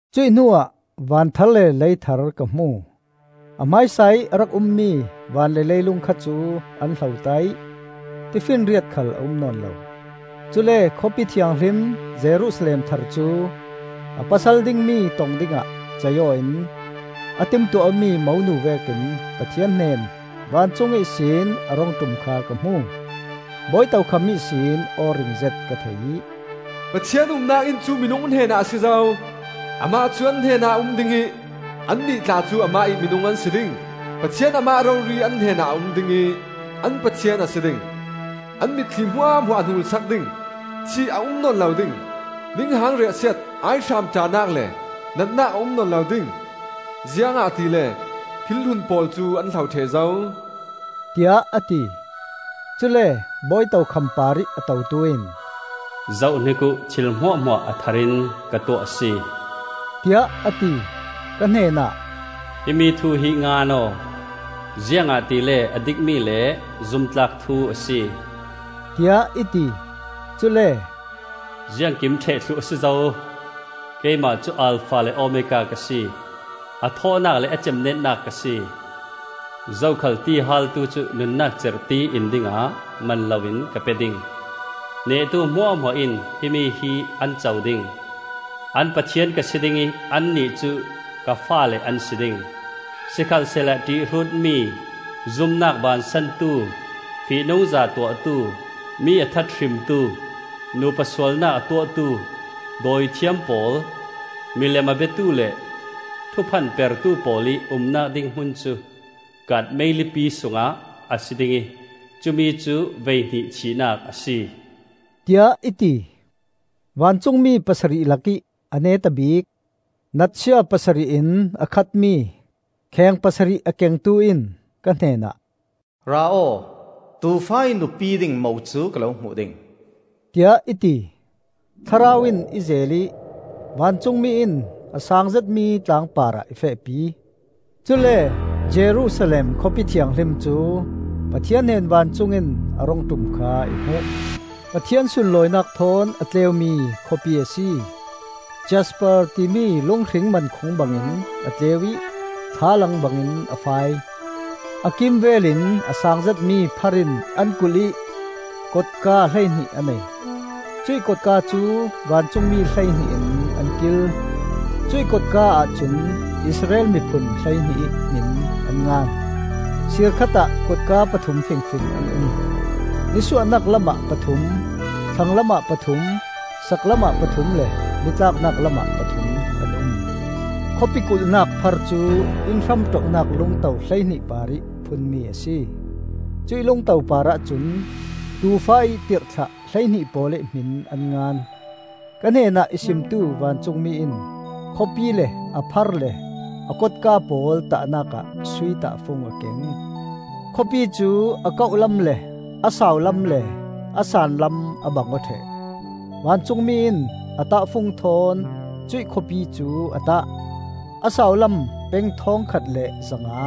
Cuih hnuah van thar le lei thar ka hmu. A hmaisa ih a rak ummi van le leilung kha cu an hlota ih tifinriat khal a um nawn lo. Cule Khawpi Thianghlim Jerusalem thar cu, a pasal dingmi tong dingah cei-aw in a timtuah awmi monu vekin Pathian hnen vancung ihsin a rung ṭum kha ka hmu. Bawi tokham ihsin aw ringzet ka thei ih, “Pathian umnak inn cu minung hnenah a si zo. Amah cu an hnenah a um ding ih annih tla cu amah ih minung an si ding. Pathian Amah rori an hnenah a um ding ih an Pathian a si ding. An mitthli hmuahhmuah a hnul sak ding. Thih a um nawn lo ding; ninghang riahsiat, aihram ṭahnak le natnak a um nawn lo ding. Ziangahtile thil hlun pawl cu an hlo ṭheh zo,” tiah a ti. Cule bawi tokham parih a totu in, “Zohhnik uh, thil hmuahhmuah a thar in ka tuah a si,” tiah a ti. Ka hnenah, “Himi thu hi ngan aw, ziangahtile a dikmi le zumtlak thu a si,” tiah i ti. Cule, “Ziangkim ṭheh thluh a si zo. Keimah cu Alfa le Omega ka si, a thawhnak le a cemnetnak ka si. Zokhal ti a haaltu cu nunnak cerhti in dingah man loin ka pe ding. Nehtu hmuahhmuah in himi hi an co ding. An Pathian ka si ding ih annih cu ka faale an si ding. Sikhalsehla ṭihhrutmi, zumnak bansantu, fihnungza tuahtu, mi a that hrimtu, nupa sualnak a tuahtu, dawithiam pawl, milem a biatu le thuphanpertu pawl ih umnak ding hmun cu kaat meilipi sungah a si ding ih cumi cu voihnih thihnak a si,” tiah i ti. Vancungmi pasarih lakih a neta bik, natsia pasarih in a khatmi kheng pasarih a kengtu in ka hnenah, “Ra aw, Tuufa ih nupi ding Mo cu ka lo hmuh ding,” tiah i ti. Thlarau in i zeel ih vancungmi in a saang zetmi tlang parah i fehpi. Cule Jerusalem, Khawpi Thianghlim cu Pathian hnen vancung in a rung ṭum kha i hmuh. Pathian sunlawinak thawn a tleumi Khawpi a si; Jasper timi lunghring mankhung bangin a tleu ih thlalang bangin a fai. A kimvel in a saang zetmi phar in an kulh ih kotka hleihnih a nei; cuih kotka cu vancungmi hleihnih in an kil. Cuih kotka ahcun Israel miphun hleihnih ih hmin an ngan. Siir khatah kotka pathum fingfing an um: nisuahnak lamah pathum, thlanglam ah pathum, saklam ah pathum le nitlaknak lamah pathum an um. Khawpi kulhnak phar cu inn-hramṭohnak lungto hleihnih parih phunmi a si; cuih lungto parah cun Tuufa ih tirhthlah hleihnih pawl ih hmin an ngan. Ka hnenah i simtu vancungmi in khawpi le a phar le a kotka pawl tahnak ah sui tahfung a keng. Khawpi cu a kauhlam le a saulam le a saanlam a bangaw ṭheh. Vancungmi in a tahfung thawn cuih khawpi cu a tah: a saulam peng thawngkhat le zanga,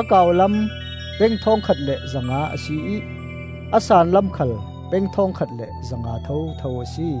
a kauhlam peng thawngkhat le zanga a si ih a saanlam khal peng thawngkhat le zanga thotho a si.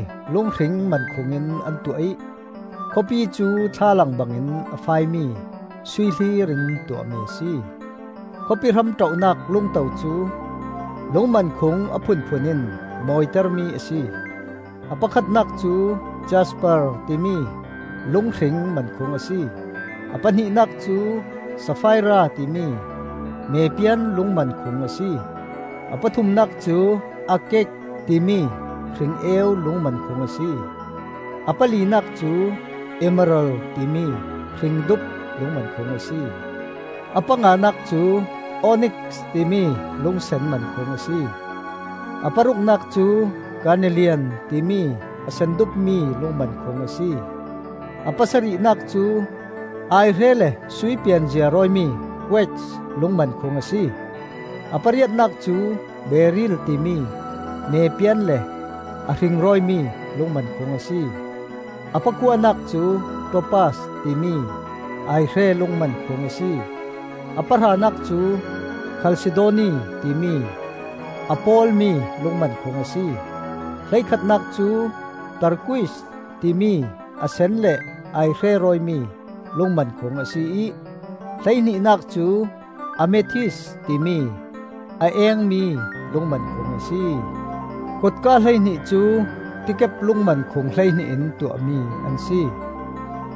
Phar cu Jasper timi lunghring mankhung in an tuah ih khawpi cu thlalang bangin a fai mi sui hlir in tuahmi a si. Khawpi hramṭohnak lungto cu lungmankhung a phunphun in mawitermi a si. A pakhatnak cu jasper timi lunghring mankhung a si, a pahnihnak cu safaira timi mepian lungmankhung a si, a pathumnak cu agate timi hring-eu lungmankhung a si, a palinak cu emerald timi hringdup lungmankhung a si; a panganak cu onix timi lungsen mankhung a si, a paruknak cu karnelian timi a sendupmi lungmankhung a si, a pasarihnak cu aihre le sui pianzia rawimi quartz lungmankhung a si, a pariatnak cu beriil timi mepian le a hring rawimi lungmankhung a si, a pakuanak cu topaz timi aihre lungmankhung a si, a pahranak cu khalsidoni timi a pawlmi lungmankhung a si, hleikhatnak cu turquoise timi a sen le aihre rawimi lungmankhung a si ih hleihnihnak cu amethyst timi a eengmi lungmankhung a si. Kotka hleihnih cu tikep lungmankhung hleihnih in tuahmi an si;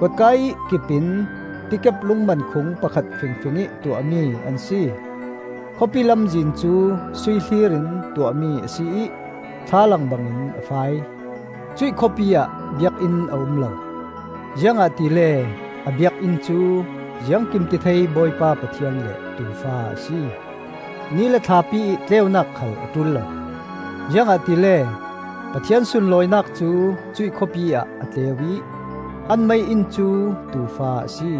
kotka ih kipin tikep lungmankhung pakhat fingfingih tuahmi an si. Khawpi lamzin cu sui hlir in tuahmi a si ih thlalang bangin a fai. Cuih khawpi ah biakinn a um lo, ziangahtile a biakinn cu Ziangkimtithei Bawipa Pathian le Tuufa a si. Ni le thlapi ih tleunak khal a ṭul lo, ziangahtile Pathian sunlawinak cu cuih khawpi ah a tleu ih an mei-inn cu Tuufa a si.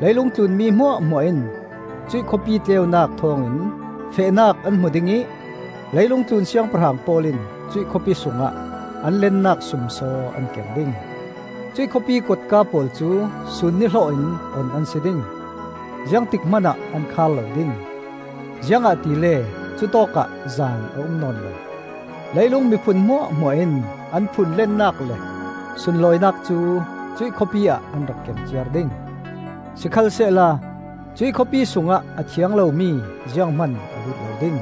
Leilung tlun mi hmuahhmuah in cuih khawpi tleunak thawngin fehnak an hmu ding ih leilung tlun siangpahrang pawl in cuih khawpi sungah an lennak sumsaw an keng ding. Cuih khawpi kotka pawl cu sun nihlawh in on an si ding; ziangtik hmanah an khar lo ding, ziangahtile cutawkah zan a um nawn lo. Leilung miphun hmuahhmuah in an phun lennak le sunlawinak cu cuih khawpi ah an rak keng ciar ding. Sikhalsehla cuih khawpi sungah a thiang lomi zianghman a lut lo ding;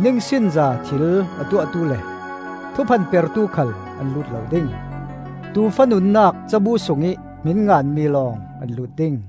ningsinza thil a tuahtu le thuphanpertu khal an lut lo ding. Tuufa nunnak cabu sungih hmin nganmi lawng an lut ding.